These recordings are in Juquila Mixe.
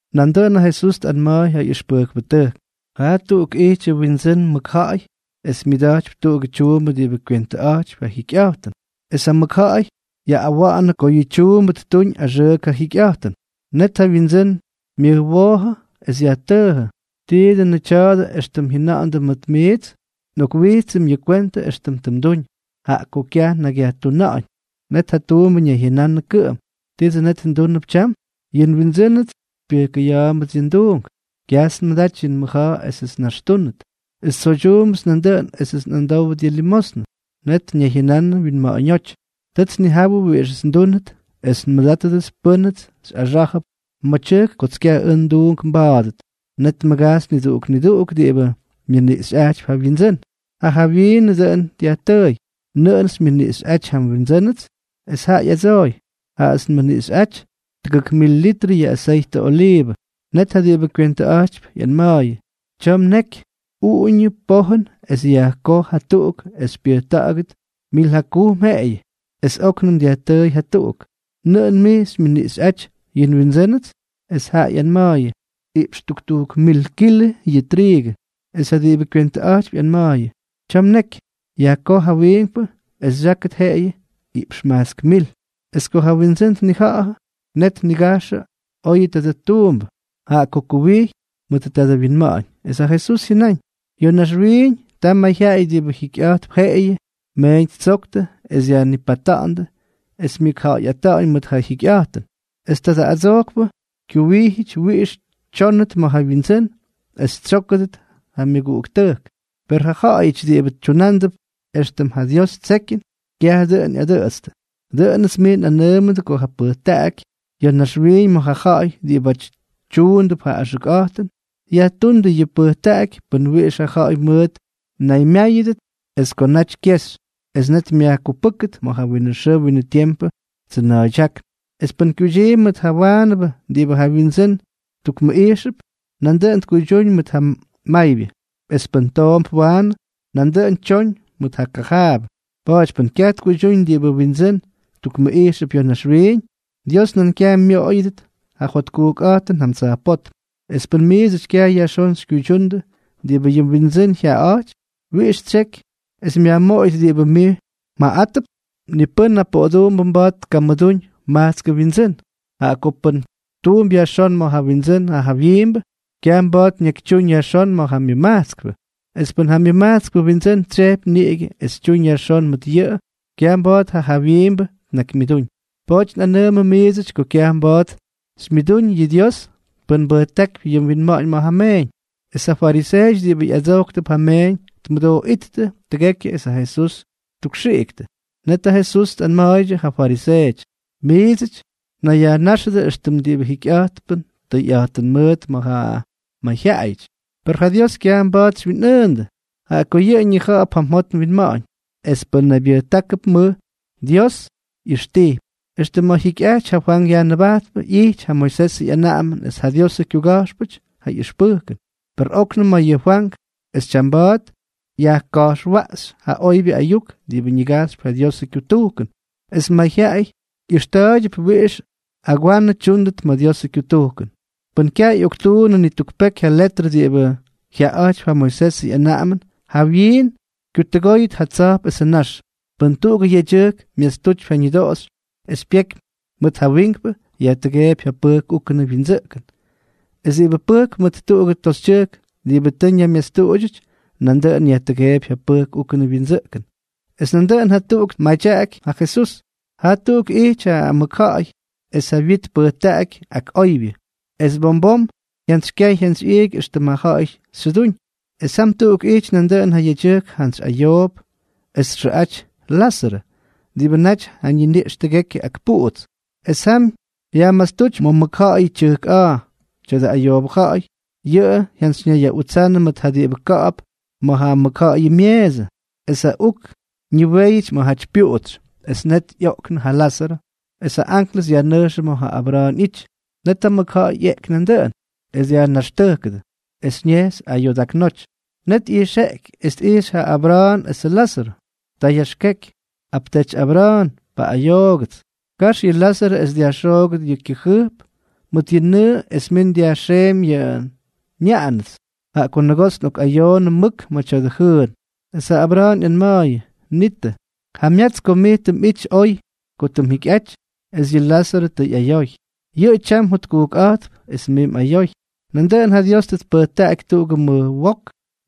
Nandʉꞌʉn ja Jesús tꞌanma̱a̱y ja ꞌyʉxpʉjkpʉtʉjk: —Jaa tuꞌuk ijtyʉ windsʉ́n mʉkja̱ꞌa̱y es myʉda̱jtypy tuꞌugʉ tyuumbʉ diꞌibʉ kywentʉꞌa̱jtypy ja jyikyꞌa̱jtʉn. Es ja mʉkja̱ꞌa̱y yaꞌꞌawa̱ꞌa̱nʉ ko yʉ tyuumbʉ ttuñ axʉʉk ja jyikyꞌa̱jtʉn. ’Net ja wyindsʉ́n myʉjwoojʉ es yajtʉʉjʉ: “¿Tii dʉnʉ tya̱a̱dʉ éxtʉm jyʉna̱ꞌa̱ndʉ mʉt mijts? Nꞌokwijtsʉm yʉ kwentʉ éxtʉm tʉ mduñ, jaꞌa ko kyaj nnakyyajtuna̱ꞌa̱ñ.” Net ja tuumbʉ ñayjyʉnanʉ kʉꞌʉm: “¿Titsʉ net ndúnʉp tyam? Yʉ nwindsʉ́nʉts xypyʉjkʉya̱a̱mbʉts yʉ nduungʉts. Kyajts nmʉdaty yʉ mʉja̱a̱ esʉts nnaxtúnʉt, es tsoydyuumbʉts nandʉꞌʉn esʉts nꞌamdówʉt yʉ limosnʉ.” Net ñayjyʉnanʉ wyinma̱ꞌa̱ñóty: “Tʉts nnijawʉ wiꞌixʉts ndúnʉt es nmʉdátʉdʉts pʉ́nʉts xyꞌaxá̱jʉp ma̱ tyʉjk kots ʉj kyaj nduunk nba̱a̱dʉt.” Net tmʉgajxy niduꞌuk niduꞌuk diꞌibʉ myʉniꞌxyꞌajtypy ja wyindsʉ́n. Ja jawyiinʉ dʉꞌʉn dyajtʉʉy: “¿Nʉꞌʉn xymyʉniꞌxyꞌáty ja nwindsʉ́nʉts?” Es jaꞌa ꞌyadsooy: “Jaꞌats nmʉniꞌxyʉty tʉgʉk mil litrʉ yʉ aseytʉ oliivʉ.” Net ja diꞌibʉ kywentʉꞌa̱jtypy ꞌyanma̱a̱yʉ: “Tya̱a̱ mneky. Uꞌuñʉ pojʉn es yajkoj jatuꞌuk es xypyʉjta̱ꞌa̱gʉt mil jakujm jeꞌeyʉ.” Es óknʉm dyajtʉʉy jatuꞌuk: “¿Nʉꞌʉn mij xymyʉniꞌxyʉty yʉ nwindsʉ́nʉts?” Es jaꞌa ꞌyanma̱a̱yʉ: “Iꞌpx tuktujk mil kilʉ yʉ triigʉ.” Es ja diꞌibʉ kywentʉꞌa̱jtypy ꞌyanma̱a̱yʉ: “Tya̱a̱ mneky. Yajkoj ja wiinkpʉ es xyákʉt jeꞌeyʉ iꞌpx majtsk mil.” Es ko ja wyindsʉ́n tnija̱ꞌa̱jʉ, net ñiga̱jxʉ oyʉ tadʉ tuumbʉ, jaꞌa ko kuwijy mʉt tadʉ wyinma̱ꞌa̱ñ. Es ja Jesús jyʉnáñ: —Ya̱ naxwiiñ, ta mayjyaꞌay diꞌibʉ jikyꞌa̱jtp jeꞌeyʉ meeñ ttsoktʉ es dyajnipata̱ꞌa̱ndʉ es myʉkja̱ꞌa̱yꞌata̱ꞌa̱ñ mʉt ja jyikyꞌa̱jtʉn. Es tadʉ adsojkpʉ kyuwijyʉty wiꞌix tyónʉt ma̱ ja wyindsʉ́n es tsyókʉdʉt ja myʉguꞌuktʉjk. Per ja ja̱ꞌa̱yʉty diꞌibʉ tyunándʉp éxtʉm ja Dios ttsekyʉn, kyaj dʉꞌʉn ꞌyadʉꞌʉtstʉ. ’Dʉꞌʉnʉts miits nꞌanʉʉmʉdʉ ko ja pʉjtaꞌaky ya̱ naxwiiñ ma̱ ja ja̱ꞌa̱y diꞌibáty tyuundʉp ja axʉkꞌa̱jtʉn, yajtúndʉ yʉ pʉjtaꞌaky pʉn wiꞌix ja ja̱ꞌa̱y mʉʉt mnaymyáyʉdʉt es ko naty kyexy, net myajkupʉ́ktʉt ma̱ ja winʉ xʉʉ winʉ tiempʉ tsʉna̱a̱ydyákn. ’Es pʉ́n kyuydyiimpy mʉt ja waanʉbʉ diꞌibʉ ja wyindsʉ́n tukmʉꞌijxʉp, nandʉꞌʉn tkuydyúñ mʉt ja maybyʉ. Es pʉ́n toomp waanʉ, nandʉꞌʉn tyoñ mʉt ja kajaabʉ. Pa̱a̱ty pʉ́n kyaj tkuydyúñ diꞌibʉ wyindsʉ́n tukmʉꞌijxʉp ya̱ naxwiiñ, Dios nan kyaj myoꞌoyʉdʉt ja jotkujkꞌa̱jtʉn jam tsa̱jpótm. Es pʉn miidsʉty kyaj yajxón xykyuydyundʉ diꞌibʉ yʉ mwindsʉ́n jyaꞌaꞌa̱jtypy, ¿wiꞌix xytsyeky es myajmoꞌoyʉt diꞌibʉ mij mjaꞌaꞌátʉp? ’Ni pʉ́n poꞌoduumbʉ mba̱a̱t tkamʉdúñ majtskʉ wyindsʉ́n. Jaꞌa ko pʉn tuump yajxón ma̱ ja wyindsʉ́n ja jawyiimbʉ, kyaj mba̱a̱t ñakytyúñ yajxón ma̱ ja myʉmajtskpʉ. Es pʉn ja myʉmajtskpʉ wyindsʉ́n tsyejpy niꞌigʉ es tyuñ yajxón mʉt yʉꞌʉ, kyaj mba̱a̱t ja jawyiimbʉ tnakymyʉdúñ. Pa̱a̱ty nꞌanʉʉmʉ miidsʉty ko kyaj mba̱a̱t xymyʉdúñ yʉ Dios pʉn mbʉjtákypy ja mwinma̱ꞌa̱ñ ma̱ ja meeñ. Es ja fariseeʉty diꞌibʉ ꞌyadsojktʉp ja meeñ tmʉdooꞌíttʉ tʉgekyʉ es ja Jesús ttukxiꞌiktʉ. Net ja Jesús tꞌanma̱a̱ydyʉ ja fariseeʉty: —Miits mnayyajnáxʉdʉ éxtʉm diꞌibʉ jikyꞌa̱jtp tʉyꞌa̱jtʉn mʉʉt ma̱ ja mayjyaꞌayʉty. Per ja Dios kyaj mba̱a̱t xywyinꞌʉʉndʉ, jaꞌa ko yʉꞌʉ ñija̱ꞌa̱p ja mjot mwinma̱ꞌa̱ñ. Es pʉ́n naybyʉjtákʉp mʉj, Dios ꞌyʉxtijpy. ’Extʉ ma̱ jyikyꞌajty ja Fwank Yajnʉbajtpʉ ꞌyijty ja Moisesʉ ꞌyanaꞌamʉn es ja Diosʉ kyuga̱jxpʉty ja ꞌyʉxpʉjkʉn. Per óknʉm ma̱ yʉ Fwank es tyamba̱a̱t yajka̱jxwaꞌxy ja oybyʉ ayuk diꞌibʉ ñigajxypy ja Diosʉ kyutujkʉn, es mayjyaꞌay ꞌyʉxta̱a̱ydyʉp wiꞌix agwanʉ tyʉ́kʉdʉt ma̱ Diosʉ kyutujkʉn. ’Pʉn kyaj ꞌyoktuunnʉ ni tuk peky ja letrʉ diꞌibʉ jyaaꞌa̱jtypy ja Moisesʉ ꞌyanaꞌamʉn, jawyiin kyutʉgóyʉt ja tsa̱jp esʉ nax. ’Pʉn tuꞌugʉ yedyʉjk myastutypy ja ñʉdoꞌoxy es pyeky mʉt ja wiinkpʉ, yajtʉgeepy ja pʉjk úkʉnʉ wyindsʉꞌkʉn. Es diꞌibʉ pʉjkp mʉt tuꞌugʉ toxytyʉjk diꞌibʉ tʉ ñaymyastuꞌudyʉty, nandʉꞌʉn yajtʉgeepy ja pʉjk úkʉnʉ wyindsʉꞌkʉn. Es nandʉꞌʉn jatuꞌuk tmadyaꞌaky ja Jesús: —Jaa tuꞌuk ijty ja mʉkja̱ꞌa̱y es ja wyit tpʉjtaꞌaky ak oybyʉ. Es bom bom jyantsykyay jyantsyꞌiiky éxtʉm ja ja̱ꞌa̱y xyʉdúñ. Es jam tuꞌuk ijty nandʉꞌʉn ja yedyʉjk jantsy ayoop es txʉꞌaty Lázarʉ, diꞌibʉ naty ja niniꞌx tʉgekyʉ ak puꞌuts. Es jam yajmastúty ma̱ mʉkja̱ꞌa̱yʉ tyʉjk a̱a̱. Tya̱dʉ ayoobʉ ja̱ꞌa̱y, yʉꞌʉ jyanayyaꞌutsanʉ mʉt ja diꞌibʉ ka̱ꞌa̱p ma̱ ja mʉkja̱ꞌa̱yʉ myeesʉ. Es ja uk ñiwéyʉty ma̱jaty ja pyuꞌuts. ’Es net ꞌyoꞌknʉ ja Lázarʉ, es ja anklʉs yajnʉjxʉ ma̱ ja Abra̱a̱n ꞌyity. Net ja mʉkja̱ꞌa̱y ꞌyeꞌky nandʉꞌʉn, es dyajnaxtʉjkʉdʉ, es ñejxy ayoodaknóty. Net ꞌyijxeꞌky es tꞌijxy ja Abra̱a̱n esʉ Lázarʉ. Ta yaxkeky: “¡Apteety Abra̱a̱n, paꞌꞌayoogʉts! Kax yʉ Lázarʉ es dyajxoogʉt yʉ kyʉꞌʉ jʉjp mʉt yʉ nʉʉ es min dyajxeemy yʉ nyaꞌanʉts, jaꞌa ko nʉgoots nꞌokꞌayoonʉ mʉk ma̱ tya̱dʉ jʉʉn.” ’Es ja Abra̱a̱n ꞌyanma̱a̱yʉ: “Nitʉ, jamyats ko mij tʉ mꞌity oy ko tʉ mjikyꞌaty, es yʉ Lázarʉ tʉ ꞌyayoy. Yʉꞌʉ tyam jotkujkꞌa̱jtp, es mij mꞌayoy. Nandʉꞌʉn ja Dios tʉ tpʉjtaꞌaky tuꞌugʉ mʉj wok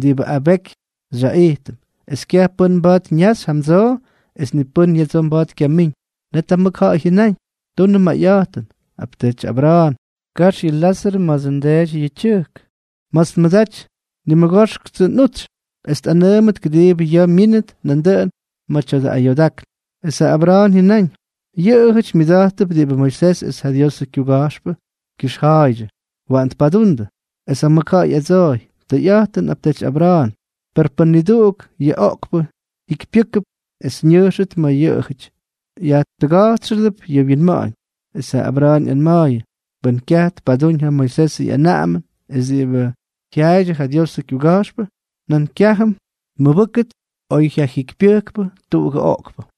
diꞌibʉ abeky xyaꞌijtʉm, es kyaj pʉ́n mba̱a̱t ñejxy jamdsoo es ni pʉ́n ya̱dsoo mba̱a̱t kyamíñ.” ’Net ja mʉkja̱ꞌa̱y jyʉnáñ: “Tunʉ mayꞌa̱jtʉn, apteety Abra̱a̱n, kax yʉ Lázarʉ ma̱dsʉ ndeety yʉ tyʉjk ma̱ts nmʉdaty nimʉgoxktsʉ nꞌutsy, es tꞌanʉʉmʉt kʉdiibʉ ya̱a̱ myínʉt nandʉꞌʉn ma̱ tya̱dʉ ayoodákn.” ’Es ja Abra̱a̱n jyʉnáñ: “Yʉꞌʉjʉty myʉda̱jttʉp diꞌibʉ Moisés es ja Diosʉ kyuga̱jxpʉ kyʉxja̱a̱ydyʉ. ¡Waꞌan tpadundʉ!” ’Es ja mʉkja̱ꞌa̱y ꞌyadsooy: “Tʉyꞌa̱jtʉn, apteety Abra̱a̱n. Per pʉn niduꞌuk yʉ oꞌkpʉ jyikypyʉ́kʉt es ñʉjxʉt ma̱ yʉꞌʉjʉty, yʉꞌʉ yajtʉga̱jtsxʉp yʉ wyinma̱ꞌa̱ñ.” ’Es ja Abra̱a̱n ꞌyanma̱a̱yʉ: “Pʉn kyaj tpadúñ ja Moisesʉ ꞌyanaꞌamʉn es diꞌibʉ jyaaydyʉ ja Diosʉ kyuga̱jxpʉ, nan kyájʉm tmʉbʉ́kʉt oy jyajikypyʉjkpʉ tuꞌugʉ oꞌkpʉ.”